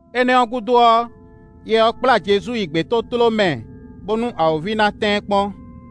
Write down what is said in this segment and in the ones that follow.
Énɛ́ ɔ́ gúdo ɔ́, Yɛ ɔ́ kplá Jezu yi gbětótló mɛ bónú awǒvi ná tɛ́n ɛ kpɔ́n.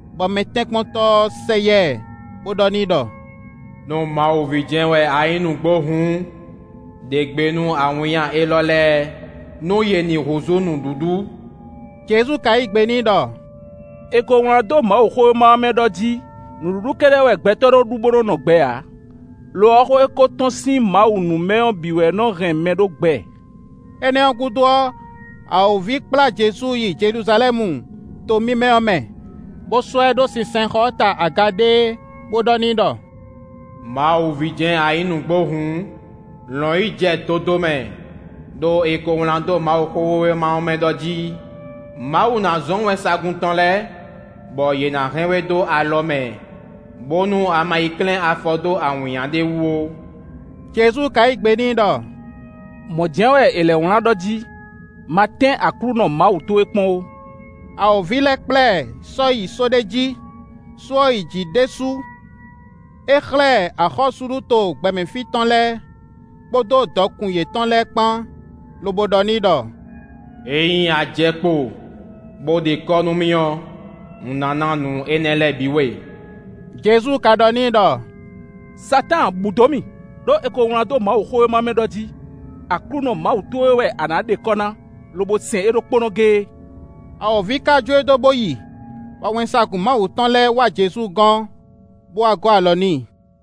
bɔ mɛtɛ́nkpɔ́ntɔ́ ɔ́ sɛ yá ɛ, bó ɖɔ n'i ɖɔ: “Nú Mawu ví jɛ́n wɛ a nyǐ nǔgbó hǔn, ɖe gbe nú awǐnnya élɔ́ lɛ́ɛ, nú yě ní húzú nǔɖuɖu.” Jezu ka yí gbe n'i ɖɔ: “È ko wlán dó Mawuxówéma ɔ́ mɛ ɖɔ jí: ‘Nǔɖuɖu kɛ́ɖɛ́ wɛ gbɛtɔ́ nɔ́ ɖu bó nɔ́ nɔ gbɛ ǎ; lo ɔ́, xó e ko tɔ́n sín Mawu nu mɛ ɔ́ bǐ wɛ nɔ́ hɛn mɛ ɖó gbɛ.’” Énɛ́ ɔ́ gúdo ɔ́, awǒvi kplá Jezu yi Jeluzalɛ́mu, to mímɛ́ ɔ́ mɛ, bó sɔ́ ɛ ɖó sinsɛnxɔ ɔ́ ta aga ɖéé, bó ɖɔ n'i ɖɔ: “Mawu ví jɛ́n a nyǐ nǔgbó hǔn, lɔ̌n yi jɛ dodomɛ; ɖó è ko wlán dó Mawuxówéma ɔ́ mɛ ɖɔ jí: ‘Mawu ná zɔ́n wɛnsagun tɔn lɛ́ɛ, bɔ yě ná hɛn we dó alɔ mɛ, bónú a ma yi klɛ́n afɔ dó awǐnnya ɖé wú ó.’” Jezu ka yí gbe n'i ɖɔ: “Mɔ̌ jɛ́n wɛ è lɛ́ wlán ɖɔ jí: ‘Ma tɛ́n Aklúnɔ Mawu towe kpɔ́n ó.’” Awǒvi lɛ́ kplá ɛ yi só ɖé jí; só ɔ́ yi jǐ ɖésú; é xlɛ́ ɛ axɔ́súɖuto gbɛmɛ fí tɔn lɛ́ɛ, kpódó dɔkun yětɔn lɛ́ɛ kpan, lobo ɖɔ n'i ɖɔ: “Ényí a jɛ kpo, bó ɖe kɔ́ nú mì ɔ́, un ná ná nǔ énɛ́ lɛ́ɛ bǐ we.” Jezu ka ɖɔ n'i ɖɔ: “Satáan, bǔ dó mì! Ɖó è ko wlán dó Mawuxówéma ɔ́ mɛ ɖɔ jí: ‘Aklúnɔ Mawu towe wɛ a nǎ ɖe kɔ́ ná, lobo sɛn é ɖokpónɔ géé.’” Awǒvi ka jó e dó bo yi; bɔ wɛnsagun Mawu tɔn lɛ́ɛ wá Jezu gɔ́n, bo wá gɔ́ alɔ n'i.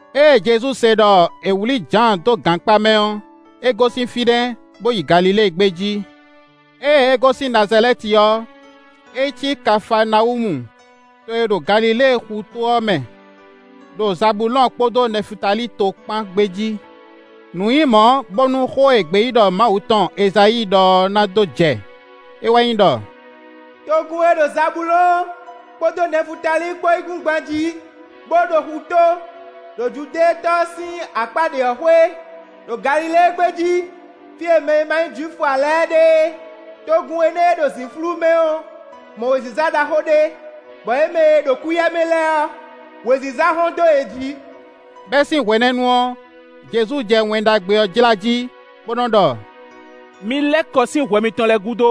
Ée Jezu se ɖɔ è wlǐ Jǎan dó gankpá mɛ ɔ́, é gosín fínɛ́, bo yi Galilée gbé jí. Ée é gosín Nazalɛ́ti ɔ́, é yi cí Kafaanawúmu, to e ɖo Galilée xutó ɔ́ mɛ, ɖo Zabulɔ́ɔn kpódó Nɛfutali to kpan gbé jí. Nǔ nyí mɔ̌, bónú xó e gbeyíɖɔ Mawu tɔn Ezayíi ɖɔ ɔ́ na dó jɛ. È wɛ nyí ɖɔ: “Togun e ɖo Zabulɔ́ɔn kpódó Nɛfutali kpó yíkúngban jí, bó ɖo xutó, ɖo Judɛ́ɛn tɔ ɔ́ sín akpá ɖě ɔ́ xwé, ɖo Galilée gbé jí, fí e mɛ e ma nyí Jwifu ǎ lɛ́ɛ ɖe é; togun énɛ́ e ɖo zǐnflú mɛ ɔ́ mɔ wěziza ɖaxó ɖé, bɔ yě mɛ e ɖo kúyɛmɛ lɛ́ɛ ɔ́, wěziza hɔ́n dó yě jí.” Bɛ́ sín hwenɛ́nu ɔ́, Jezu jɛ Wɛn Ɖagbe ɔ́ jlá jí, bo nɔ ɖɔ: “Mi lɛ́ kɔ sín hwɛ mitɔn lɛ́ɛ gúdo,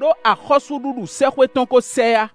ɖó axɔ́súɖuɖu sɛ́xwé tɔn ko sɛ yá.”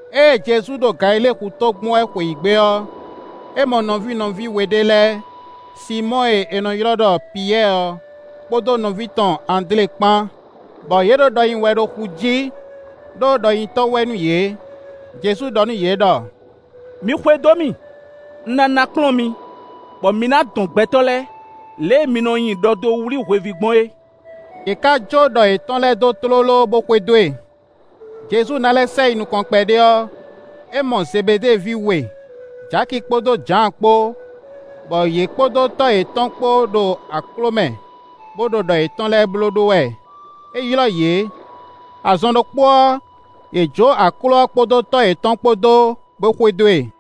Ée Jezu ɖo Galilée xutó gbɔn wɛ xweyǐgbe ɔ́, é mɔ nɔví nɔví we ɖé lɛ́ɛ, Sinmɔ́ɔ e è nɔ ylɔ́ ɖɔ Piyɛ́ɛ ɔ́, kpódó nɔví tɔn Andlé kpán, bɔ yě ɖo ɖɔ nyi wɛ ɖo xu jí, ɖó ɖɔnyitɔ́ wɛ nú yě. Jezu ɖɔ nú yě ɖɔ: “Mi xwedó mì; un ná ná kplɔ́n mi, bɔ mi ná nɔ dɔn gbɛtɔ́ lɛ́ɛ, lě e mi nɔ nyi ɖɔ dó wlí hweví gbɔn é.” Yě ká jó ɖɔ yětɔn lɛ́ɛ dó tlóló bó xwedó e. Jezu ná lɛ́ sɛ yi nukɔn kpɛɖé ɔ́, é mɔ Zebeɖée ví we, Jaki kpódó Jǎan kpó, bɔ yě kpódó tɔ́ yětɔn kpó ɖo akló mɛ, bo ɖo ɖɔ yětɔn lɛ́ɛ blóɖó wɛ. É ylɔ́ yě. Azɔn ɖokpó ɔ́, yě jó akló ɔ́ kpódó tɔ́ yětɔn kpó dó, bó xwedó e.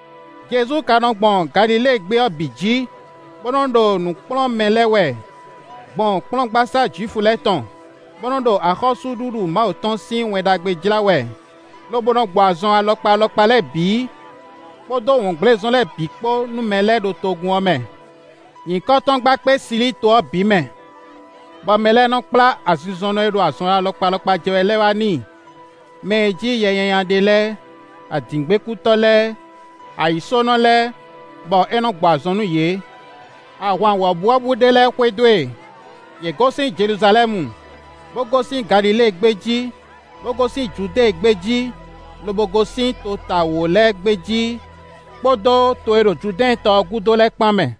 Jezu ka nɔ gbɔn Galilée gbé ɔ́ bǐ jí, bó nɔ́ ɖo nǔ kplɔ́n mɛ lɛ́ɛ wɛ, gbɔn kplɔ́ngbasá Jwifu lɛ́ɛ tɔn, bó nɔ́ ɖo axɔ́súɖuɖu Mawu tɔn sín Wɛn Ɖagbe jlá wɛ, lobo nɔ gbɔ azɔn alɔkpa alɔkpa lɛ́ɛ bǐ, kpódó wɔngblézɔn lɛ́ɛ bǐ kpó nú mɛ lɛ́ɛ ɖo togun ɔ́ mɛ. Nyǐkɔ tɔn gba kpé Silíito ɔ́ bǐ mɛ, bɔ mɛ lɛ́ɛ nɔ kplá azinzɔnnɔ e ɖo azɔn alɔkpa alɔkpa jɛ wɛ lɛ́ɛ wá n'i; mɛ e jí yɛ nyanya ɖe lɛ́ɛ, adǐngbekútɔ́ lɛ́ɛ, ayǐsónɔ lɛ́ɛ, bɔ é nɔ gbɔ azɔn nú yě. Ahwan wɔ̌buwɔ́bú ɖé lɛ́ɛ xwedó e; yě gosín Jeluzalɛ́mu, bó gosín Galilée gbé jí, bó gosín Judée gbé jí, lobo gosín tota wǒ lɛ́ɛ gbé jí kpódó to e ɖo Judɛ́ɛn tɔ ɔ́ gúdo lɛ́ɛ kpan mɛ.